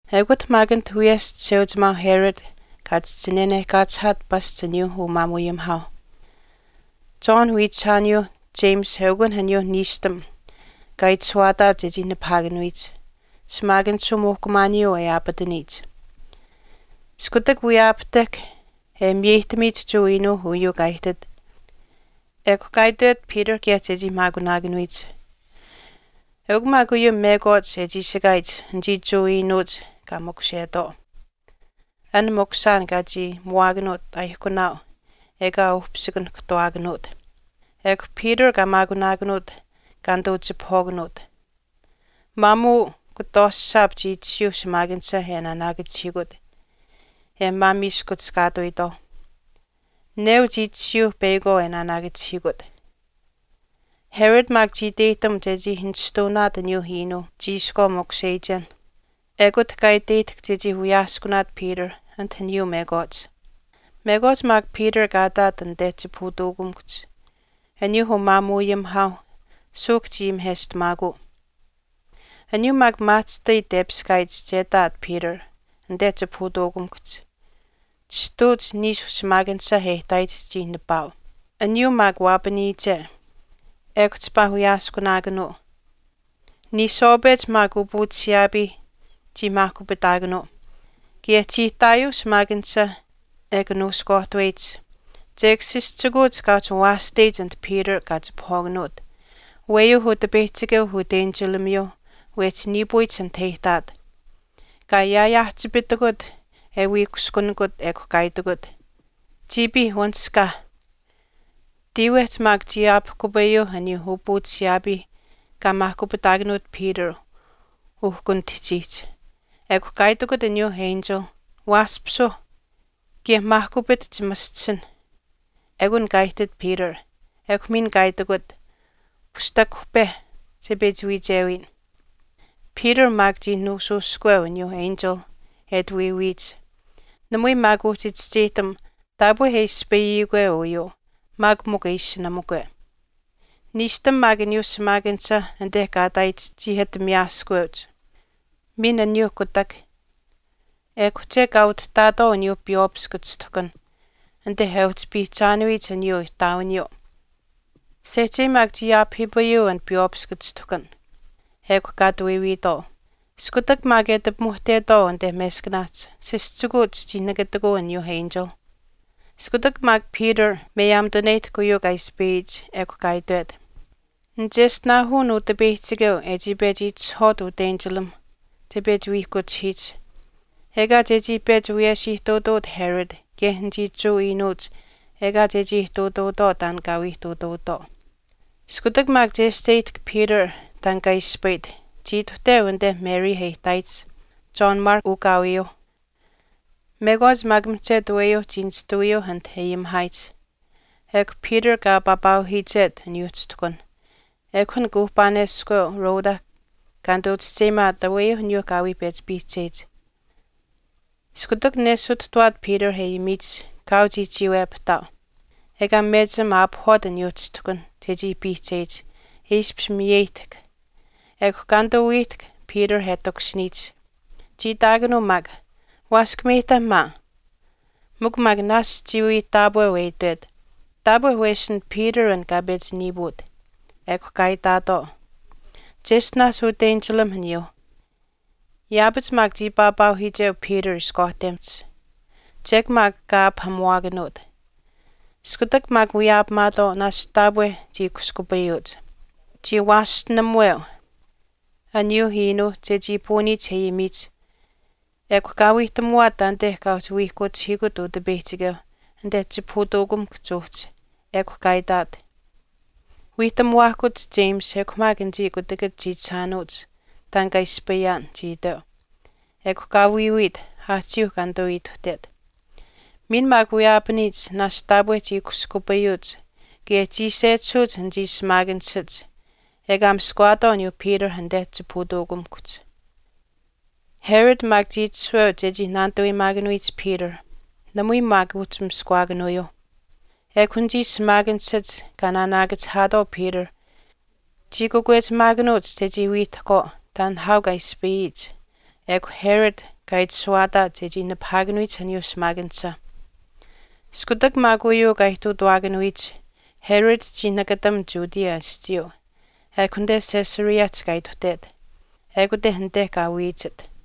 Ekut maak anit wiyesh Chisheuchimaau Herod kaa chihchi nanehkaachihaat pasch aniyuu umaamuuayimihaauh. John wiichishaaniyuuh James eukun aniyuu niishtam kaa itashuwaataat che nipahaakanuyich, shimaakanishuu muuhkumaaniyuu e aapataniyich. Iskutak wiyaapahtahk e miyeyihtamiyich Jewa iinuuh uyuu kaa ihtit, ekw kaa itwet Peter kaye chechii maakunaakanuyich. Eukw maak uyuu mekwaach e chiishikaayich anichii Jewa iinuuch kaa makushetwaau, an makushaan kaa chii muwaakanuut aaihkunaau ekaa uhpisikanihkahtuwaakanuut. Ekw Peter kaa maakunaakanuut kaa nituu chipahwaakanuut. Maamuu kutwaashaap chii tashiyuu shimaakanisha e naanaakachihiikut, e maamiiskuchishkaatuyitwaau. Neu chii tashiyuu peyakwaau e naanaakachihiikut. Herod maak chii iteyihtam chechii nishtuunaat aniyuu iinuu chiishkwaa makusheyichen. Ekut kaa iteyihtahk chechii wiyaaskunaat Peter anit aniyuu mekwaach. Mekwaach maak Peter kaa ihtaat anite chipahutuukamikuhch aniyuu umaamuuayimihaauh suuhk chii ayimiheshtamaakuu. Aniyuu maak maahchishtai tepiskaayich che ihtaat Peter anite chipahutuukamikuhch chistuuch niishu shimaakanisha e ihtaayich chii nipaau. Aniyuu maak waapaniyiche ekw chipaa wiyaaskunaakanuu. Niishwaapech maak upuuchishiyaapii chii maahkupitaakanuu. Kaye chii ihtaayuuh shimaakanisha e kanuushkuwaahtaweyich. Chek sischikuuch kaa uhchi waashteyich anit Peter kaa chipahwaakanuut, aweyuu Utipeyihchikeu utenchilamiyuu wehchi niipuyich anit e ihtaat. Kaa yaayaahchipitikut e wii kushkunikut ekw kaa itikut, “Chiipiih wanishkaa.” Tiiwehch maak chii ayaapahkupaayuuh aniyuu upuuchishiyaapiih kaa maahkupitaakanuut Peter uhkunitihchiihch. Ekw kaa itikut aniyuu enchil, “Waaspisuu, kaye maahkupit chimaschisinh.” Ekun kaa ihtit Peter ekw miin kaa itikut, “Pushtakuhpe, che pechi wiichewiyin.” Peter maak chii nuushuushkuweu aniyuu enchil e ati wiiwiyich. Namui maak uhchi chischeyihtam taapwe e ispayikwe uyuu maak mikw e ishinamukwe. Niishtam maak aniyuu shimaakanisha anite kaa ihtaayich chii ati miyaaskaweuch, miin aniyuu kutak, ekw chek kaa utihtaatwaau aniyuu piywaapiskw chishtuhkan anite e uhchi piihchaanuyich aniyuu ihtaawiniyuu. Sehchei maak chii aapahiipayuu an piywaapiskw chishtuhkan, ekw kaa ati wiiwiitwaau. Iskutak maak e ati pimuhtetwaau anite meskanaahch, sischikuuch chii nakatikuu aniyuu enchil. Iskutak maak Peter miyaamituneyihtahk uyuu kaa ispayit, ekw kaa itwet, “Nicheshtinaahun Utipeyihchikeu e chii pechi itishahwaat utenchilam che pechi wiihkuchihiyich, ekaa chechii pechi wiyesh ihtuutuut Herod kaye anichii Jewa iinuuch ekaa chechii ihtuutuutwaau taan kaa wii ihtuutuutwaau.” Iskutak maak chescheyihtahk Peter taan kaa ispayit, chii ituhteu anite Mary e ihtaayich, John Mark ukaawiyuuh. Mekwaach maak mihchetu aweyuuh chii nishtawiyuuh anit e ayimihaayich. Ekw Peter kaa papaauhiichet aniyuu chishtuhkan, ekw an kuuhpaaneskweu Rhoda kaa nituu chischeyimaat aweyuu aniyuu kaa wii pechi piihcheyich. Iskutak nesituhtawaat Peter e ayimiyich, kaau chii chiiwepahtaau ekaa mechim aapahwaat aniyuu chishtuhkan chechii piihcheyich e ishpish miyeyihtahk. Ekw kaa nituu wiihtahk Peter e takushiniyich. Chii itaakanuu maak, “Waaskameyihta maa.” Mikw maak naashch chii wii taapweu e itwet, Taapwe wesin Peter an kaa pechi niiput. Ekw kaa itaatwaau, “Cheshtinaash utenchilam aniyuuh.” Yaapach maak chii papaauhiicheu Peter ishkwaahtemihch. Chek maak kaa aapahamuwaakanuut, iskutak maak wiyaapamaatwaau, naashch taapwe chii kushkupayuuch. Chii waashtenamuweu aniyuuh iinuuh chechii puuniyich e ayimiyich. Ekw kaa wiihtamuwaat taanite kaa uhchi wiihkuchihiikut Utipeyihchikeu anite chipahutuukamikuhch uhchi. Ekw kaa itaat, “Wiihtamuwaahkuch James ekw maak anichii kutakach chiichishaanuuch taan kaa ispayaan,” chii iteu. Ekw kaa wiiwiit, aahchiiuh kaa nituu ituhtet. Miin maak wiyaapaniyich, naashch taapwe chii kushkupayuuch kaye chii sechisuuch anichii shimaakanishach ekaa miskawaatwaau aniyuu Peter anite chipahutuukamikuhch. Herod maak chii itashuweu chechii naanituweyimaakanuyich Peter, namui maak uhchi miskawaakanuyuuh. Ekw anichii shimaakanishach kaa naanaakachihaatwaau Peter chii kakwechimaakanuuch chechii wiihtahkwaau taan nihaau kaa ispayiyich, ekw Herod kaa itashuwaataat chechii nipahaakanuyich aniyuu shimaakanisha. Iskutak maak uyuu kaa ihtuutawaakanuyich, Herod chii nakatam Judea aschiiyuu, ekw anite Caesareahch kaa ituhtet. Ekute anite kaa wiichit.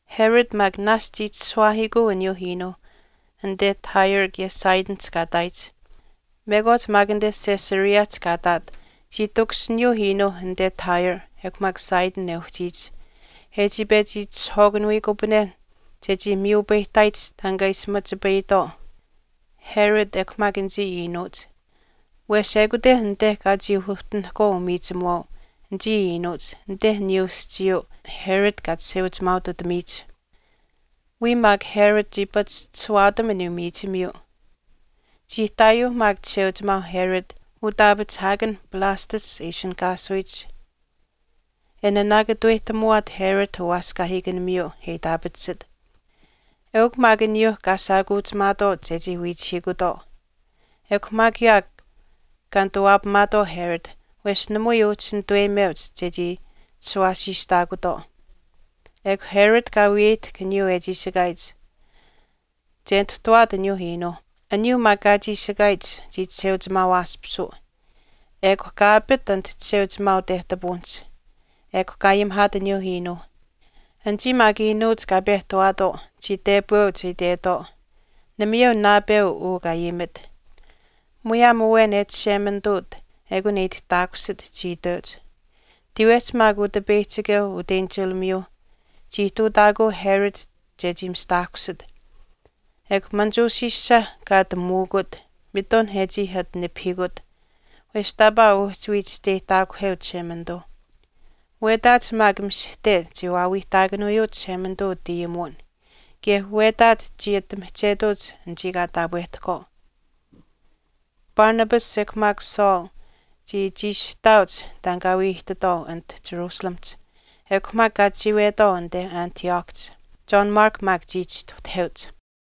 Herod maak naashch chii chishuwaahiikuu aniyuu iinuuh anite Tyrehch kaye Sidonihch kaa ihtaayich. Mekwaach maak anite Caesareahch kaa ihtaat chii takushiniyuu iinuu anite Tyre ekw maak Sidon e uhchiyich e chii pechi itishahwaakanuyikupanen chechii miyupayihtaayich taan kaa ishi machipayitwaau Herod ekw maak anichii iinuuch. Wesh ekute anite kaa chii uhtinihkwaau umiichimuwaau anichii iinuuch anite aniyuu aschiiyuu Herod kaa chisheuchimaaututamiyich. Wiya maak Herod chii pachishtishuwaatam aniyuu miichimiyuu. Chii ihtaayuuh maak chisheuchimaau Herod utaapachihaakan Blastus e ishinihkaasuyich, e naanaakatuweyihtamuwaat Herod uwaaskaahiikanimiyuu e itaapatisit. Eukw maak aniyuu kaa shaakuuchimaatwaau chechii wiichihiikutwaau, ekw maak yaakw kaa nituwaapamaatwaau Herod wesh namui uhchi nituweyimeuch chechii chishuwaasiistaakutwaau. Ekw Herod kaa wiyeyihtahk aniyuu e chiishikaayich che nituhtuwaat aniyuu iinuuh. Aniyuu maak kaa chiishikaayich chii chisheuchimaawaaspisuu, ekw kaa apit anit chisheuchimaau tehtapuwinihch ekw kaa ayimihaat aniyuu iinuu. Anichii maak iinuuch kaa pehtawaatwaau chii tepweuch e itwetwaau, “Namayeu naapeu uu kaa ayimit, muyaam awen e Chishemanituut ekun e itihtaakusit,” chii itweuch. Tiiwehch maak Utipeyihchikeu utenchilamiyuu chii ihtuutaakuu Herod chechii mistaahkusit, ekw manichuushiisha kaa ati muukuut mitun e chii ati nipahiikut, wesh taapaa uhchi wii chisteyihtaakuheu Chishemanituu. Wetaach maak mishihte chii waawiihtaakanuyuu Chishemanituu utayimuwin kaye wetaach chii ati mihchetuuch anichii kaa taapwehtahkwaau. Barnabas ekw maak Saul chii chiishihtaauch taan kaa wii ihtitwaau anite Jerusalemihch, ekw maak kaa chiiwetwaau anite Antiochihch. John Mark maak chii chistuhtaheuch.